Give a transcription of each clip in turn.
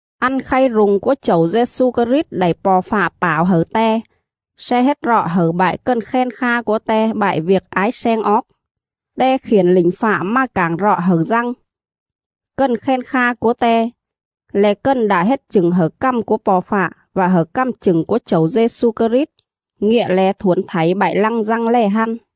Ăn khay rung cúa Chẩu Dê-xu Krit đảy Po̱ Fạ pảo hẩư Te sle hết rọ hẩư bại cần khen kha cúa Te bại viêc ái sleng oóc. Te khiển lỉnh fạ mà cảng rọ hẩư Dăng, cần khen kha cúa Te, le̱ cần đạ hết chửng hẩư cằm cúa Po̱ Fạ vạ hẩư cằm chửng cúa Chẩu Dê-xu Krit, ngịa le̱ thuổn thảy bại lăng Dăng lè hăn.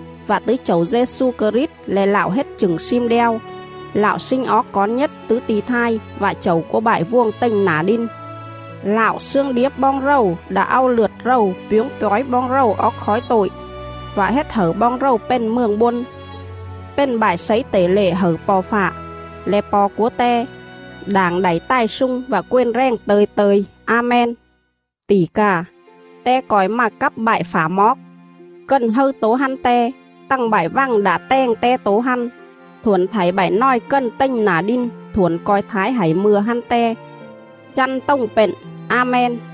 vạ tứ Chẩu Dê-xu Krit le̱ Lạo hết chửng slim đeo, Lạo sling oóc cón nhết tứ ti̱ thai vạ Chẩu cúa bại vuồng tềnh nả đin! Lạo slương điếp boong rầu đạ au lượt rầu pjuống pjói boong rầu oóc khói tội,. vạ hết hẩư boong rầu pền Mường Bôn, pền bại slấy tể lệ hẩư Po̱ Fạ, le̱ Po̱ cúa Te, đảng đảy tài slung vạ quền rèng tơ̱i tơ̱i! A-men.. Tỉ cà, Te co̱i mà cắp bại phả moóc! Cần hâư tố hăn Te, tằng bại vằng đạ tèng Te tố hăn; thuổn thảy bại nòi cần tềnh nả đin thuổn co̱i thái hảy mư̱a hăn Te.. Chăn tồng pện! A-men.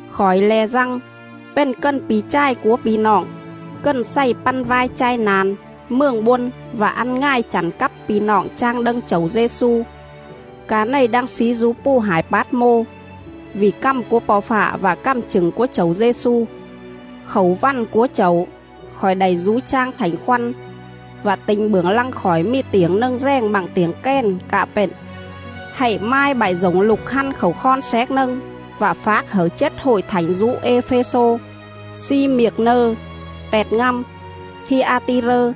Khỏi le̱ Dăng, pền cần pi̱ chài cúa pi̱ noọng, cần xày păn vai chai na̱n, Mường Bôn vạ ăn ngài chẳn cắp pi̱ noọng chang đâng Chẩu Dê-xu, ca này đang slí dú pù hải Pát-mô, vỉ cằm cúa Po̱ Fạ vạ cằm chửng cúa Chẩu Dê-xu. Khảu vằn cúa Chẩu, khỏi đảy dú chang Thảnh Khoăn vạ ti̱nh bưởng lăng khỏi mì tiểng nâng rèng bặng tiểng kèn cạ pện: “Hạy mai bại dổng lục hăn khảu khon xéc nâng vạ phác hẩư chết Hội Thảnh dú Ê-phê-xô, Xi-miệc-nơ, Pẹt-ngăm, Thi-a-ti-rơ,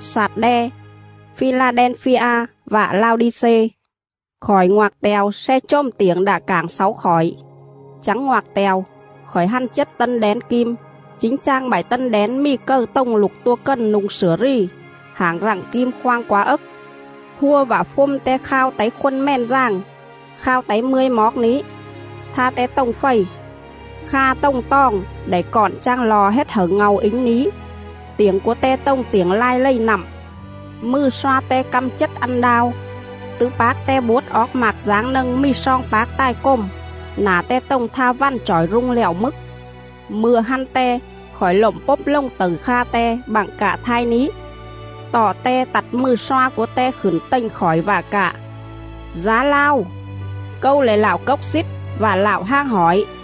Xạt-đe, Phi-la-đen-phi-a vạ Lao-đi-xê.” Khỏi ngoạc te̱o sle chồm tiểng đạ cảng xáu khỏi. Chắng ngoạc te̱o, khỏi hăn chết tân đén kim, chính chang bại tân đén mì cầư tồng Lục Tua Cần nu̱ng slửa rì, hảng rặng kim khoang quá ấc.. Hua vạ phjôm Te khao táy khôn mèn dàng, khao táy mươi moóc ní; tha Te tồng fầy;. kha tồng toòng đảy cọn chang lo hết hẩư ngàu ính ní; tiểng cúa Te tồng tiểng lai lầy nặm.. Mừ sloa Te căm chết ăn đao; tứ pác Te buốt oóc mạc dáng nâng mì sloong pác tài cồm; nả Te tồng tha vằn chỏi rung lẹo mức. Mư̱a hăn Te, khỏi lộm pốp lồng tẩư kha Te bặng cạ thai ní. Tọ Te tặt mừ sloa cúa Te khửn tềnh khỏi vạ cạ: “Dá lao, Câu le̱ Lạo Cốc Xít vạ Lạo Hang Hỏi,.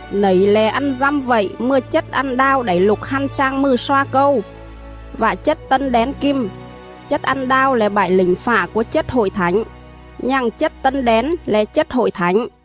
Nẩy le̱ ăn dăm vậy mừa chết ăn đao đảy lục hăn chang mừ sloa Câu, vạ chết tân đén kim: Chết ăn đao le̱ bại lỉnh fạ cúa chết Hội Thảnh, nhằng chết tân đén le̱ chết Hội Thảnh.”